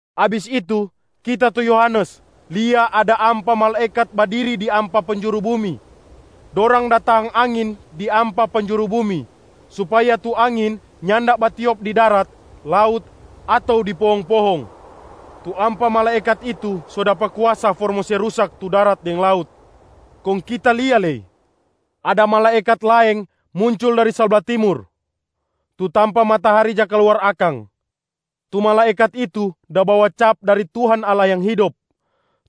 Abis itu, kita tu Yohanes lia ada ampa malaekat badiri di ampa penjuru bumi. Dorang da tahang angin di ampa penjuru bumi supaya tu angin nyanda batiop di darat, laut, ato di pohong-pohong. Tu ampa malaekat itu so dapa kuasa for mo se rusak tu darat deng laut. Kong kita lia lei ada malaekat laeng muncul dari sabla timur, tu tampa matahari ja kaluar akang. Tu malaekat itu da bawa cap dari Tuhan Allah yang hidop.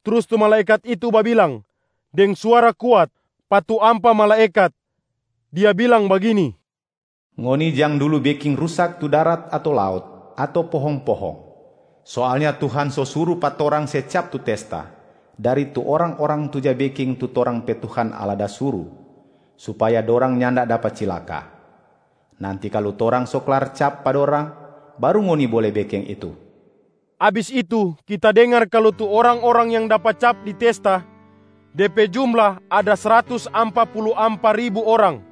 Trus tu malaekat itu babilang deng suara kuat pa tu ampa malaekat, dia bilang bagini, “Ngoni jang dulu beking rusak tu darat ato laut ato pohong-pohong! Soalnya Tuhan so suru pa torang se cap tu testa dari tu orang-orang tu ja beking tu torang pe Tuhan Allah da suru, supaya dorang nyanda dapa cilaka. Nanti kalu torang so klar cap pa dorang, baru ngoni bole beking itu.” Abis itu kita dengar kalu tu orang-orang yang dapa cap di testa, de pe jumla ada sratus ampa pulu ampa ribu orang.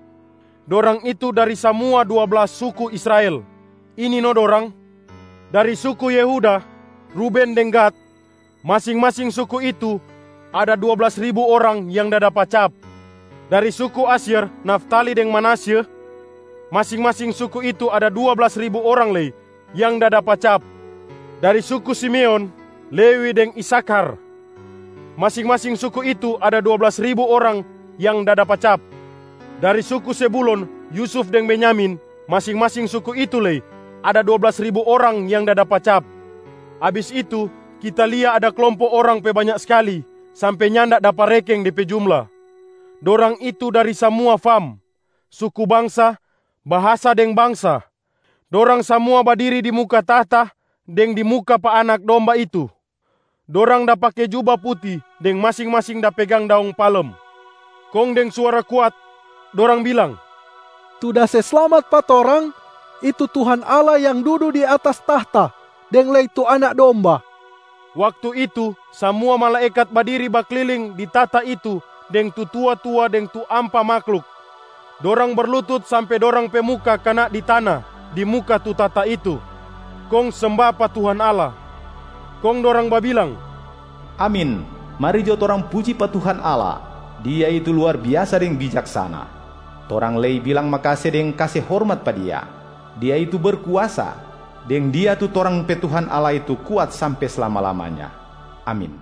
Dorang itu dari samua dua blas suku Israel. Ini no dorang: Dari suku Yehuda, Ruben deng Gad, masing-masing suku itu ada dua blas ribu orang yang da dapa cap. Dari suku Asyer, Naftali deng Manasye, masing-masing suku itu ada dua blas ribu orang lei yang da dapa cap. Dari suku Simeon, Lewi deng Isakhar, masing-masing suku itu ada dua blas ribu orang yang da dapa cap. Dari suku Zebulon, Yusuf, deng Benyamin, masing-masing suku itu lei ada dua blas ribu orang yang da dapa cap. Abis itu, kita lia ada klompo orang pe banya skali sampe nyanda dapa rekeng de pe jumla. Dorang itu dari samua fam, suku bangsa, bahasa deng bangsa. Dorang samua badiri di muka tahta deng di muka pa Anak Domba itu. Dorang da pake juba puti deng masing-masing da pegang daong palem. Kong deng suara kuat dorang bilang, “Tu da se slamat pa torang, itu Tuhan Allah yang dudu di atas tahta, deng lei tu Anak Domba.” Waktu itu samua malaekat badiri bakliling di tahta itu deng tu tua-tua deng tu ampa mahluk. Dorang berlutut sampe dorang pe muka kana di tana di muka tu tahta itu, kong semba pa Tuhan Allah. Kong dorang babilang, “Amin! Mari jo torang puji pa Tuhan Allah. Dia itu luar biasa deng bijaksana. Torang lei bilang makase deng kase hormat pa Dia. Dia itu berkuasa, deng Dia tu torang pe Tuhan Allah itu kuat sampe slama-lamanya! Amin.”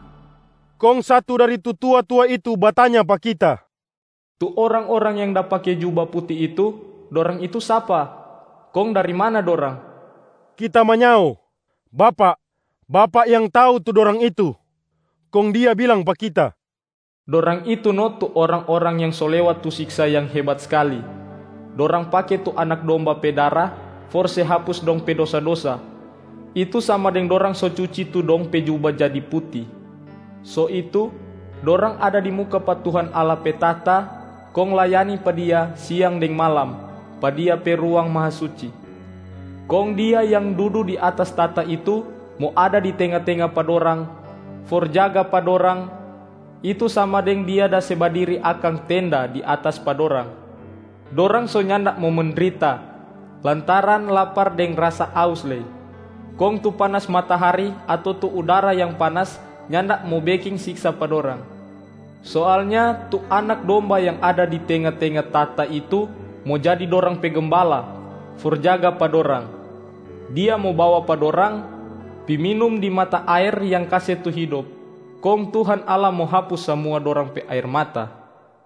Kong satu dari tu tua-tua itu batanya pa kita, “Tu orang-orang yang da pake juba puti itu, dorang itu sapa? Kong dari mana dorang?” Kita manyao, “Bapak, bapak yang tau tu dorang itu.” Kong dia bilang pa kita, “Dorang itu no tu orang-orang yang so lewat tu siksa yang hebat skali. Dorang pake tu Anak Domba pe dara for se hapus dong pe dosa-dosa, itu sama deng dorang so cuci tu dong pe juba jadi puti. So itu, dorang ada di muka pa Tuhan Allah pe tahta kong layani pa Dia siang deng malam pa Dia pe Ruang Mahasuci. Kong Dia yang dudu di atas tahta itu mo ada di tenga-tenga pa dorang for jaga pa dorang, itu sama deng Dia da se badiri akang tenda di atas pa dorang. Dorang so nyanda mo mendrita lantaran lapar deng rasa aus lei. Kong tu panas matahari ato tu udara yang panas nyanda mo beking siksa pa dorang. Soalnya tu Anak Domba yang ada di tenga-tenga tahta itu mo jadi dorang pe Gembala for jaga pa dorang. Dia mo bawa pa dorang pi minum di mata aer yang kase tu hidop, kong Tuhan Allah mo hapus samua dorang pe aer mata.”